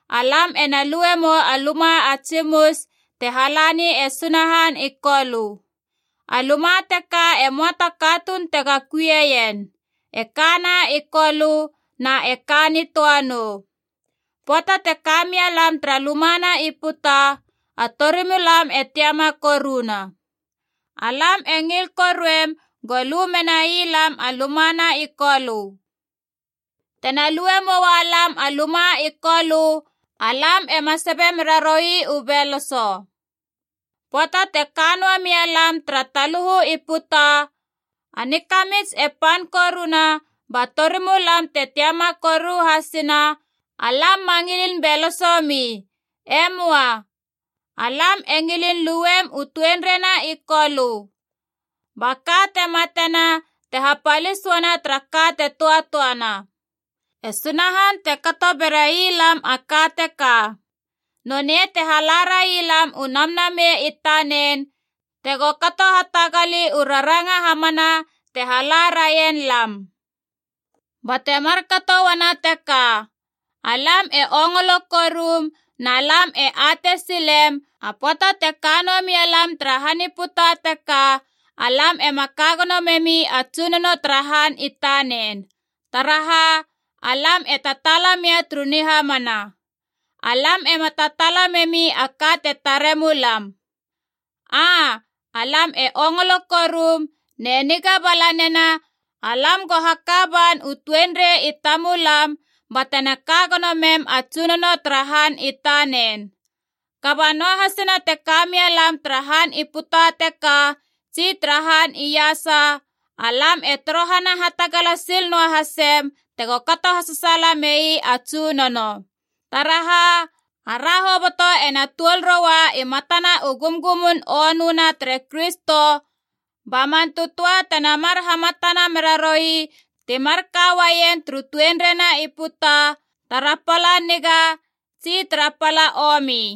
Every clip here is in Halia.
alam ena luemou a luma a tsimus te halani e Sunahan i Kolö. A luma teka e möa ta katuun tega kuieien, e kana i Kolö na e ka nitöa nou. Pöata te ka mia lam tara luma na i puta, a torimulam e tiama koruna. Alam e ngil koruem go lu menai lam a luma na i Kolö. Tena lue moua lam a luma i Kolö, alam ema sabe meraroi u beloso. Pöata te ka noa mia lam tara taluhu i puta, a nikamits e pan koruna ba torimulam te tiama koru hasina, alam ma ngilin beloso mi. E möa. Alam e ngilin luem u tuenreina i Kolö. Ba ka te matena te hapalis uana tara ka te töatöana. E Sunahan te kato berai lam a ka teka. Nonei te hala railam u Namnamei i tanen tego kato hatagali u raranga hamana te hala raien lam. Bate markato uana teka, alam e ongolo korum na lam e atei silem, a pöata te ka noa mia lam tara han i puta teka, alam ema ka gono memi a Tsunono tara han i tanen. Taraha, alam e tataala mia turu nihamana. Alam ema tataala memi a ka te tare mulam. Aa, alam e ongolo korum ne niga bala nena alam go haka ban u tuenrei i tamulam batena ka gono mem a Tsunono tara han i tanen. Kaba noahasina te ka mia lam tara han i puta teka tsi tara han iasa, alam e torohana hatagala sil noa hasem tego kato hasasaala mei a Tsunono. Taraha, ara hoboto ena tuol roua i matana u gumgumun onöna tere Kristo ba man tötöa tena mar hamatana meraroi ti marka uaien turu tuenreina i puta, tara pala niga tsi tara pala omi.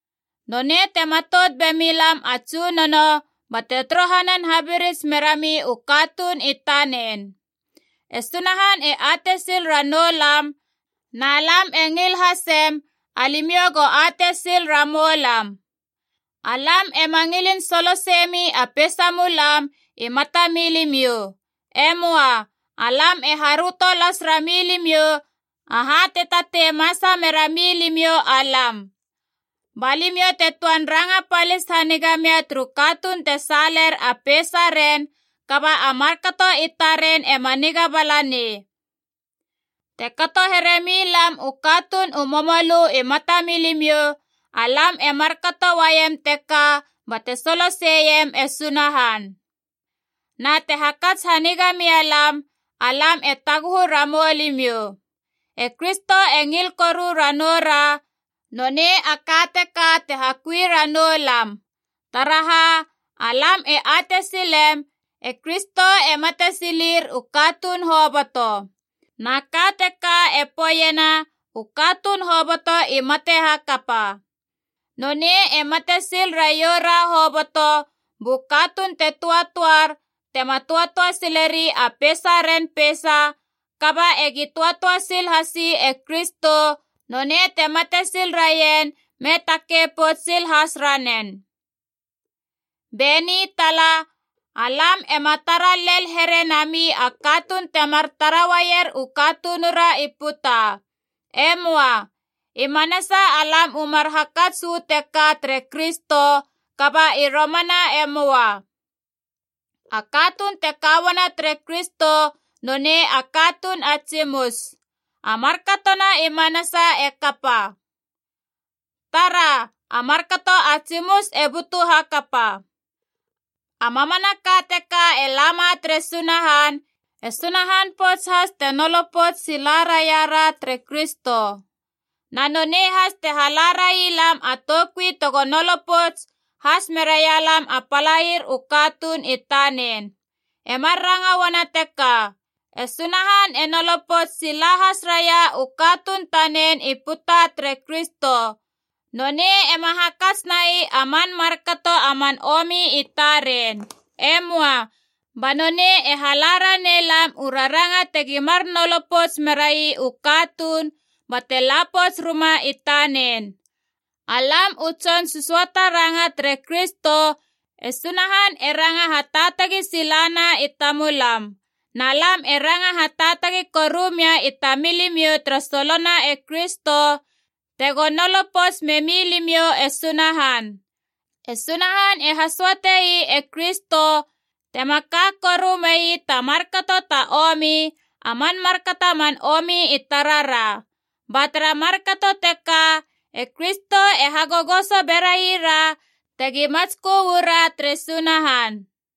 Nonei te matout bemi lam a Tsunono bate torohanan habirits merami u katuun i tanen. E Sunahan e atei sil ranou lam, na lam e ngil hasem alimiou go atei sil ramou lam. Alam ema ngilin soloseiemi a peisamulam i matamilimiou. E möa. Alam e haröto las rami limiou aha te tatei masa merami limiou alam. Ba limiou te töan ranga palis haniga mia turu katuun te saaler a peisaren kaba a markato i taren ema niga bala nei. Te kato here mi lam u katuun u momolö i matamilimiou, alam e markato uaiem teka bate soloseiem e Sunahan. Na te hakats haniga mia lam, alam e taguhu ramou limiou. E Kristo e ngil koru ranoura, nonei a ka teka te hakui ranou lam. Taraha, alam e atei silem e Kristo e mate silir u katuun hoboto. Na ka teka e poeiena u katuun hoboto i mate hakapa. Nonei e mate sil raiora hoboto, bu katuun te töatöar, tema töatöa sileri a peisaren peisa, kaba egi töatöa sil hasi e Kristo, nonei te mate sil raien me takei pouts sil has ranen. Be ni tala, alam ema tara lel here nami a katuun temar tara uaier u katunura i puta. E möa. I manasa alam u mar hakats uu teka tere Kristo, kaba i romana e möa. A katuun te ka uana tere Kristo, nonei a katuun a tsimus. A markatona i manasa e kapa. Tara, a markato a tsimus e butu hakapa. A mamanaka teka e lama tere Sunahan, e Sunahan pouts has te nolo pouts sila raira tere Kristo. Na nonei has te hala rai lam a toukui te go nolo pouts has merai lam a palair u katuun i tanen. E mar ranga uana teka, e Sunahan e nolo pouts sila has raia u katuun tanen i puta tere Kristo. Nonei ema hakats nai a man markato a man omi i taren. E möa. Ba nonei e hala ranei lam u raranga tegi mar nolo pouts merai u katuun bate la pouts ruma i tanen. Alam u tson sösöata ranga tere Kristo, e Sunahan e ranga hataatagi sila na i tamulam. Na lam e ranga hataatagi koru mia i tamilimiou tara solona e Kristo, tego nolo pouts memi limiou e Sunahan. E Sunahan e hasöatei e Kristo, tema ka korumei ta markato ta omi, a man markato a man omi i tarara. Ba tara markato teka e Kristo e hagogoso beraira tegi matskö uu ra tere Sunahan.